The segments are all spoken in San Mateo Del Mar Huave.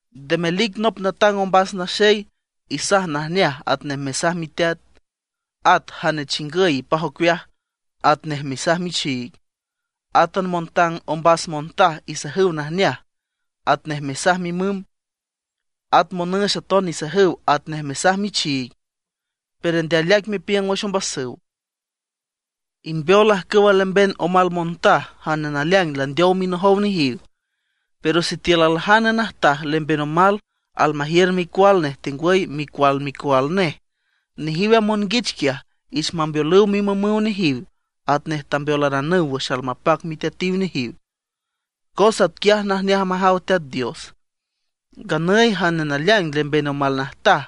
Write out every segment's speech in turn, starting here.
Nde melic nop natang ombas naxey, isaj najneaj atnej mesaj miteat. At jane chingüy ipaj ocueaj atnej mesaj michiig. Átan montang ombas montaj isajüw najneaj atnej mesaj mimüm. At monüx aton isajüw atnej mesaj michiig, pero nde aleaic mepiüng wüx ombasüw. Imbeol ajcüwa lemben omal montaj jane naleaing landeow minojow nejiw. Pero sitiül aljane najtaj lemben omal almajiür micual nej tengwüy micual micual nej, nejiw a monguich quiaj ich mambeolüw mimümüw nejiw atnej tambeolaranüw wüx almapac miteatiw nejiw, cos atquiaj najneaj majaw Teat Dios. Nganüy jane naleaing lemben omal najtaj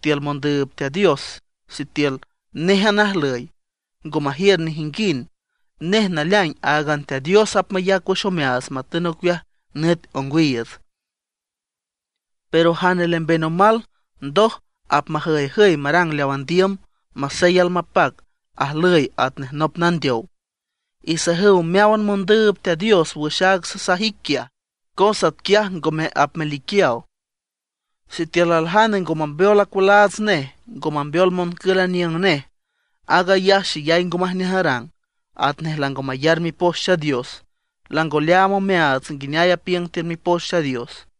tiül mondüüb Teat Dios sitiül néjan ajlüy, ngo majiür nejinguind, nej naleaing áagan Teat Dios apmayac wüx omeaats matün ocueaj nüt ongwiiüts. Pero jane lemben omal ndoj apmajüyjüy marang leaw andiüm, masey almapac, ajlüy atnej nop nandeow. Isajüw meáwan mondüüb Teat Dios wüx aaga sasaj ic quiaj, cos atquiaj ngome apmeliquiaw. Sitiül aljane ngo mambeol acualaats nej, ngo mambeol moncül aniüng nej, aag ayaj xeyay ngo majneaj arang, atnej lango mayar Mipoch Teat Dios, lango leaam omeaats nguineay apiüng tiül Mipoch Teat Dios.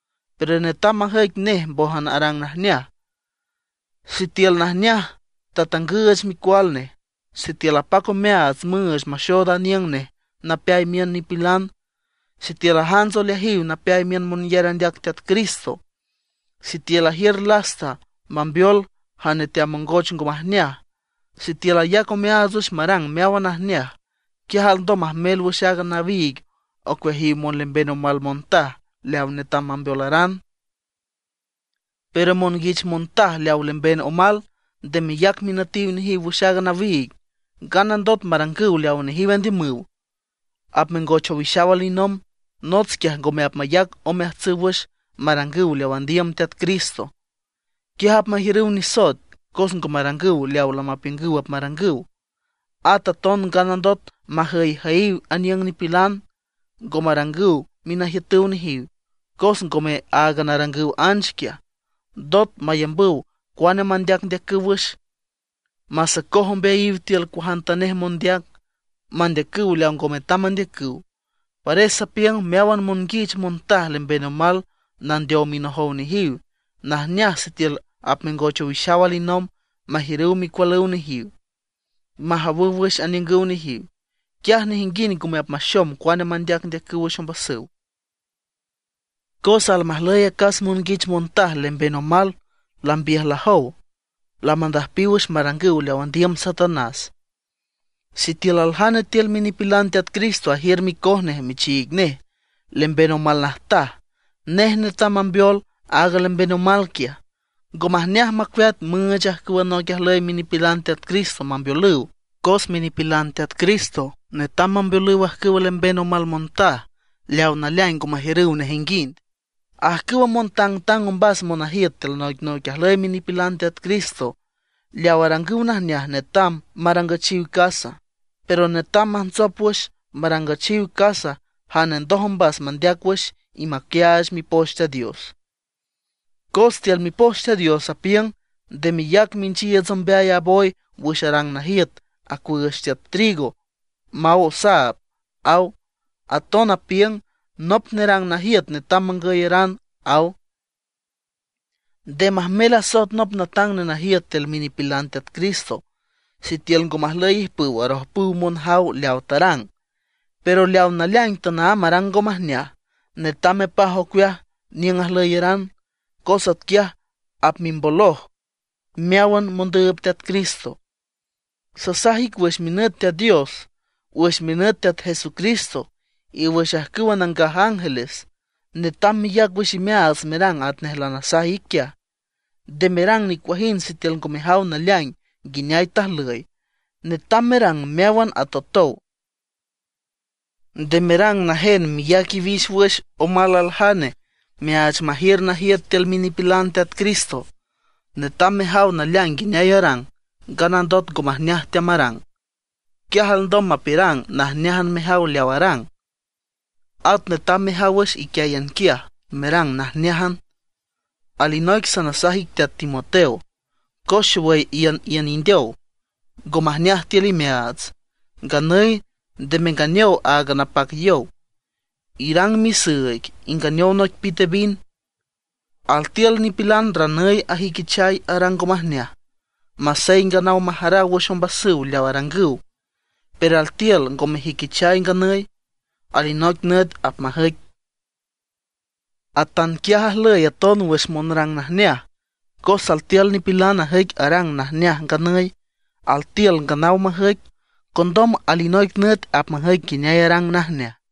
Pero netam majüic nej mbójan arang najneaj. Sitiül najneaj tatangüüch micual nej, sitiül apac omeaats müüch maxood aniüng nej napeay miün nipilan; sitiül ajants oleajiw napeay miün monyar andeac Teat Cristo; sitiül ajiür lasta mambeol jane teamongoch ngo majneaj; sitiül ayac omeaats wüx marang meáwan najneaj; quiaj alndom majmel wüx aaga nawiig ocueajiw monlemben omal montaj leaw netam mambeolaran. Pero monguich montaj lemben omal nde meyac minütiw nejiw wüx aaga nawiig, nganandot marangüw leawa nejiw andiümüw, apmengoch owixaw alinomb. Nots quiaj ngome apmayac omeajtsüw wüx marangüw leaw andiüm Teat Cristo. Quiaj apmajiürüw nisoet cos ngo marangüw leaw lamapiüngüw apmarangüw. At aton nganandot majüyjüyiw aniüng nipilan, ngo marangüw minajiütüw nejiw. Cos ngome áagan arangüw anch quiaj, ndot mayambüw cuane mandeacndeacüw wüx, masocoj ombeayiw tiül cuajantanej mondeac, mandeacüw leaw ngo metam mandeacüw. Pares sapiüng meáwan monguich montaj lemben omal nandeow minojow nejiw, najneaj sitiül apmengoch owixaw alinomb, majiürüw micualüw nejiw, majawüw wüx aniüngüw nejiw. Quiaj nejinguind ngome apmaxom cuane mandeacndeacüw wüx ombasüw. Cos almajlüy acas monguich montaj lemben omal lambiüjlajow, lamandüjpiw wüx marangüw leaw andiüm Satanás. Sitiül aljane tiül minipilan Teat Cristo ajiür micoj nej michiig nej lemben omal najtaj, nej netam mambeol aaga lemben omal quiaj. Ngo majneaj macueat müüch ajcüw noic ajlüy minipilan Teat Cristo mambeolüw. Cos minipilan Teat Cristo netam mambeolüw ajcüwa lemben omal montaj leaw naleaing ngo majiürüw nejinguind. Ajcüwa montangtang ombas monajiüt tiül noicnoic ajlüy minipilan Teat Cristo leaw arangüw najneaj netam marangüchiw casa, pero netam majntsop wüx marangüchiw casa jane ndoj ombas mandeac wüx y maquiaach Mipoch Teat Dios. Cos tiül Mipoch Teat Dios apiüng: “Nde meyac minchiiüts ombeay a boy wüx arang najiüt acuüüch tiüt trigo maw osaab”, aw. Aton apiüng: “Nop nerang najiüt netam mangüyaran”, aw. Nde majmel asoet nop natang nenajiüt tiül minipilan Teat Cristo, sitiül ngo majlüy ijpüw arojpüw monjaw leawa tarang. Pero leawa naleaing tanaámb arang ngo majneaj, netam mepaj ocueaj niüng ajlüyaran, cos atquiaj apmimboloj meáwan mondüüb Teat Cristo. Sasaj ic wüx minüt Teat Dios, wüx minüt Teat Jesucristo, y wüx ajcüwa nangaj ángeles, netam meyac wüx imeaats merang atnej lanasaj ic quiaj. Nde merang nicuajind sitiül ngo mejaw naleaing nguineay tajlüy; netam merang meáwan atotow. Nde merang najen meyac iwix wüx omal aljane meaach majiür najiüt tiül minipilan Teat Cristo. Netam mejaw naleaing nguineay arang, nganandot ngo majneaj teamarang, quiaj alndom mapiürang najneájan mejaw leaw arang. At netam mejaw wüx iquiáyan quiaj, merang najneájan. Alinoic sanasaj ic teat Timoteo, cos xowüy iüniün indeow, ngo majneaj tiül imeaats. Nganüy nde menganeow áagan napac yow; irang misüüig inganeow noic pite vin. Altiül nipilan ranüy ajüiquichay arang ngo majneaj, masey nganaw majaraw wüx ombasüw leaw arangüw. Pero altiül ngo mejüiquichay nganüy, alinoic nüt apmajüic. Atanquiaj ajlüy aton wüx monrang najneaj, cos altiül nipilan ajüic arang najneaj nganüy, altiül nganaw majüic, condom alinoic nüt apmajüic nguineay arang najneaj.